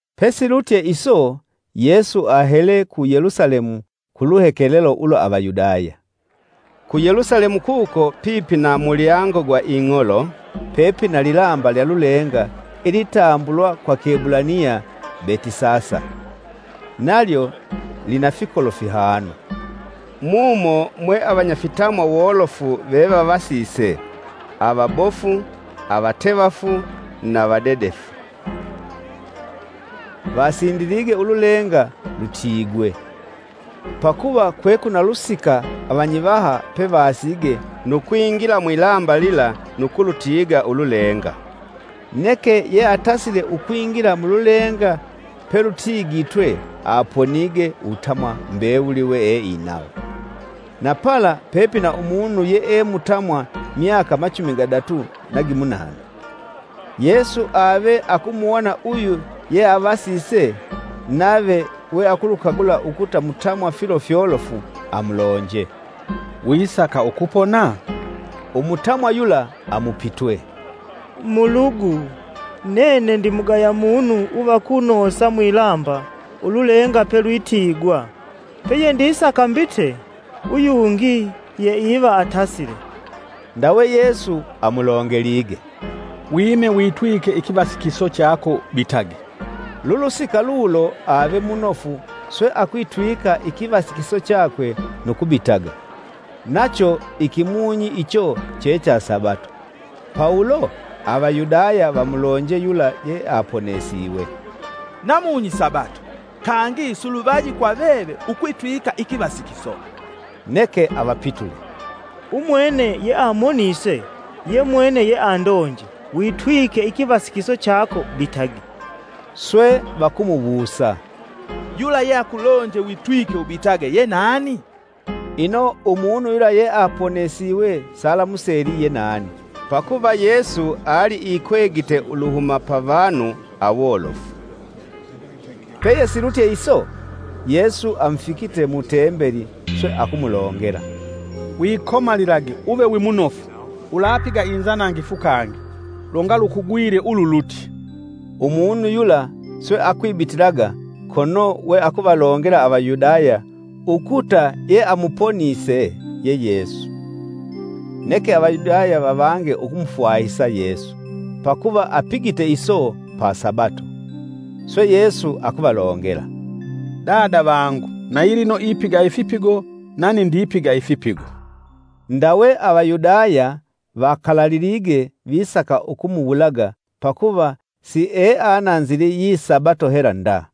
Pesilutye iso Yesu ahele ku Yelusalemu ku luhekelelo ulwa Avayudaya. Ku Yelusalemu kuko pipi na mulyango gwa ing'olo, pepina lilamba lya lulenga ilitambulwa kwa kiebulaniya Betisasa, nalyo lina fikolo fihanu. Mumo mwe avanyafitamwa wolofu vevavasise; avabofu, avatevafu, na vadedefu, [Vasindilige ululenga lutiigwe. Pakuva kwekwina lusika avanyivaha pevasige nu kwingila mwilamba lila nu kulutiiga ululenga. Neke yeatasile ukwingila mululenga pelutiigitwe aponige uwutamwa mbewuli weeinawo.] Na pala pepina umunu yeemutamwa myaka machumi gadatu na gimunana. Yesu ave akumuwona uyu yeavasise, nave we akulukagula ukuta mutamwa filo fyolofu amulonje, “Wisaka ukupona?” Umutamwa yula amupitwe, “Mulugu, nene ndimugaya munu uva kunoosa mwilamba ululenga pelwitiigwa, peyendisaka mbite uyungi yeiva atasile.” Ndawe Yesu amulongelige, “Wime witwike ikivasikiso chako bitage.” Lulusika lulo ave munofu swe akwitwika ikivasikiso chakwe nu kubitaga. Nacho ikimunyi icho che cha Sabato. Pa ulo Avayudaya vamulonje yula yeaponesiwe, “Namunyi Sabato, kangi siluvaji kwa veve ukwitwika ikivasikiso.” Neke avapitule, “Umwene yeamonise ye mwene yeandonje: ‘Witwike ikivasikiso chako bitage.’” Swe vakumuwusa, “Yula yeakulonje witwike ubitage ye nani?” Ino umunu yula yeaponesiwe salamuseli ye nani, pakuva Yesu ali ikwegite uluhuma pa vanu awolofu. Peyesilutye iso, Yesu amufikite mu Tembeli, swe akumulongela, “Wikomalilage uve wimunofu; ulapiga inzanangifu kangi, longa lukugwile ululutye.” Umunu yula swe akwibitilaga kono we akuvalongela Avayudaya ukuta yeamuponise ye Yesu. Neke Avayudaya vavange ukumufwahisa Yesu, pakuva apigite iso pa Sabato. Swe Yesu akuvalongela, “Dada vangu na yilino ipiga ifipigo nani ndipiga ifipigo.” Ndawe Avayudaya vakalalilige visaka ukumuwulaga pakuva sieananzili yi Sabato hela nda,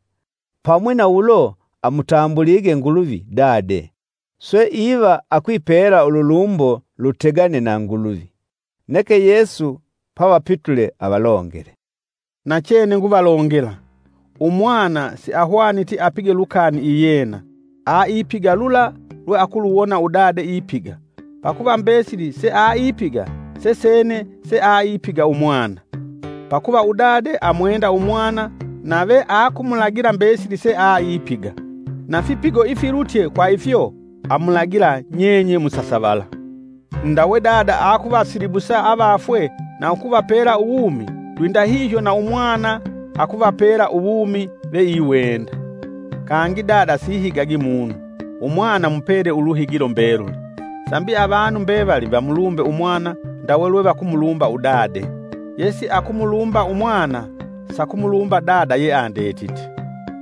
pamwi na ulo amutambulige Nguluvi Dade, swe iva akwipela ululumbo lutegane na Nguluvi. Neke Yesu pavapitule avalongele, “Nachene nguvalongela, Umwana siahwaniti apige lukani iyena; aipiga lula lweakuluwona udade ipiga, pakuva mbesili seaipiga sesene seaipiga Umwana. Pakuva Udade amwenda Umwana nave akumulagila mbesili seaipiga, na fipigo ifilutye kwa ifyo amulagila nyenye musasavala. Ndawe Dada akuvasilibusa avafwe na ukuvapela uwumi, lwindahihyo na umwana akuvapela uwumi veiwenda. Kangi Dada sihigagi munu. Umwana amupelye Umwana uluhigilo mbeluli, Sambi avanu mbevali vamulumbe Umwana ndawe lwe vakumulumba Dade. Yesiakumulumba Umwana sakumulumba Udade yeandetite.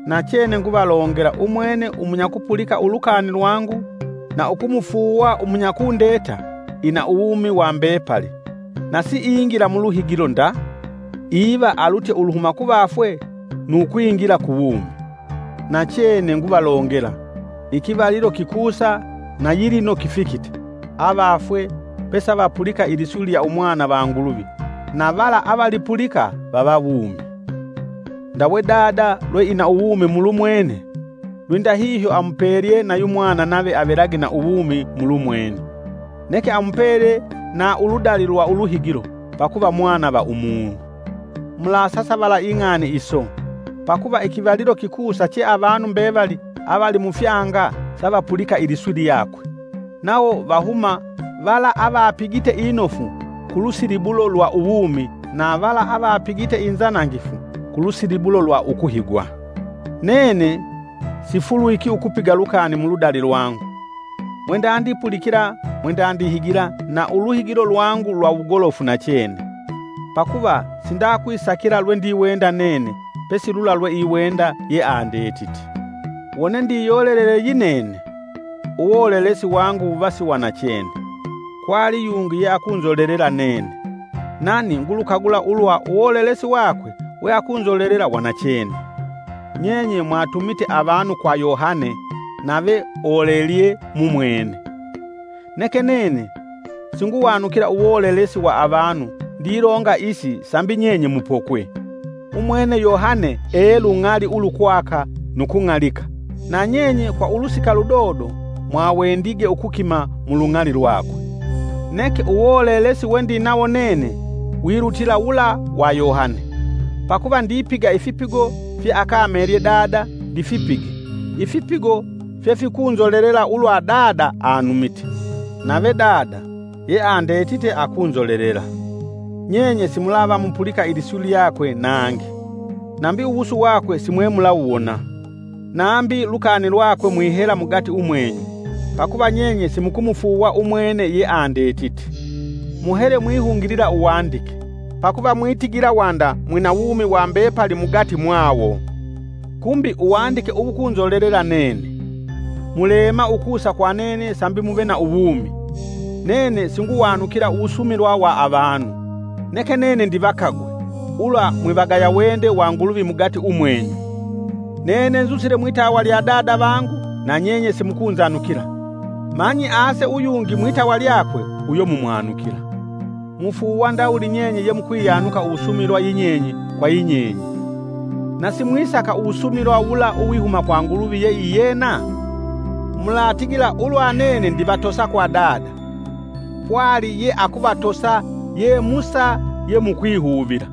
“Nachene nguvalongela umwene umunya kupulika ulukani lwangu na ukumufuuwa umunyakundeta ina uwumi wa mbepali. Na siingila mu luhigilo nda, iva alutye uluhuma kuvafwe nu kwingila ku wumi. Nachene nguvalongela, ikivalilo kikusa na yilino kifikite, avafwe pesavapulika iliswi lya Umwana va Nguluvi, na vala avalipulika vava wumi. Ndawe Dada lwe ina wumi mulumwene, lwindahihyo amupelye na yumwana nave avelage na uwumi mulumwene. Neke amupele na uludali lwa uluhigilo, pakuva Mwana va umunu. Mulasasavala ing'ani iso, pakuva ikivalilo kikusa che avanu mbevali avali mufyanga savapulika iliswi lyakwe, nawo vahuma: vala avapigite inofu ku lusilibulo lwa uwumi, na vala avapigite inzanangifu ku lusilibulo lwa uluhigilo ukuhigwa. “Nene sifulwiki ukupiga lukani muludali lwangu, mwendandipulikila mwendandihigila na uluhigilo lwangu lwa wugolofu nachene. Pakuva sindakwisakila lwendiwenda nene pesi lula lwe iwenda yeandetite. Wone ndiyolelele yinene, uwolelesi wangu wuva si wa nachene. Kwali yungi yeakunzolelela nene, nani ngulukagula ulwa uwolelesi wakwe weakunzolela wa nachene. Nyenye mwatumite avanu kwa Yohane nave olelelye mumwene. Neke nene singuwanukila uwolelesi wa avanu ndilonga isi sambi nyenye mupokwe. Umwene Yohane e lung'ali ulukwaka nu kung'alika, na nyenye kwa ulusika ludodo mwawendige ukukima mu lung'ali lwakwe. Neke uwolelesi wendinawo nene wilutila wula wa Yohane. Pakuva ndipiga ifipigo, fye akamelye Dada ndifipige, ifipigo fyefikunzolelela ulwa Dada anumite. Nave Dada, yeandete akunzolelela. Nyenye simulava mupulika iliswi lyakwe nangi, nambi uwusu wakwe simwe mulawuwona, nambi lukani lwakwe mwihela mugati umwenyu, pakuva nyenye simukumufuuwa umwene yeandetite. Muhele mwihungilila Uwandike pakuva, mwitigila wanda mwina wumi wa mbepali mugati mwayo; kumbi Uwandike uwukunzolelela nene! Muleema ukusa kwa nene sambi muve na uwumi. “Nene singwanukila uwusumilwa wa avanu. Neke nene ndivakagwe, ulwa mwivagaya wende wa Nguluvi mugati umwenyu. Nene nzusile mwitawa lya Dada vangu na nyenye simukunzanukila, manyi ase uyungi mwitawa lyakwe uyo mumumwanukila. Mufuuwa ndawuli nyenye yemukwiyanuka uwusumilwa yinyenye kwa yinyenye, na simwisaka uwusumilwa wula uwihuma kwa Nguluvi yeiyena? Mulatigila ulwa nene ndivatosa kwa Dada. Pwali yeakuvatosa ye Musa ye mukwihuvila.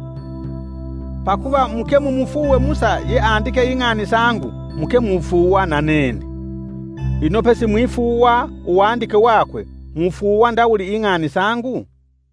Pakuva muke mumufuuwe Musa ye andike ing'ani sangu, muke mufuuwa na nene. Ino pesimwifuuwa uwandike wakwe mufuuwa ndawuli ing'ani sangu?”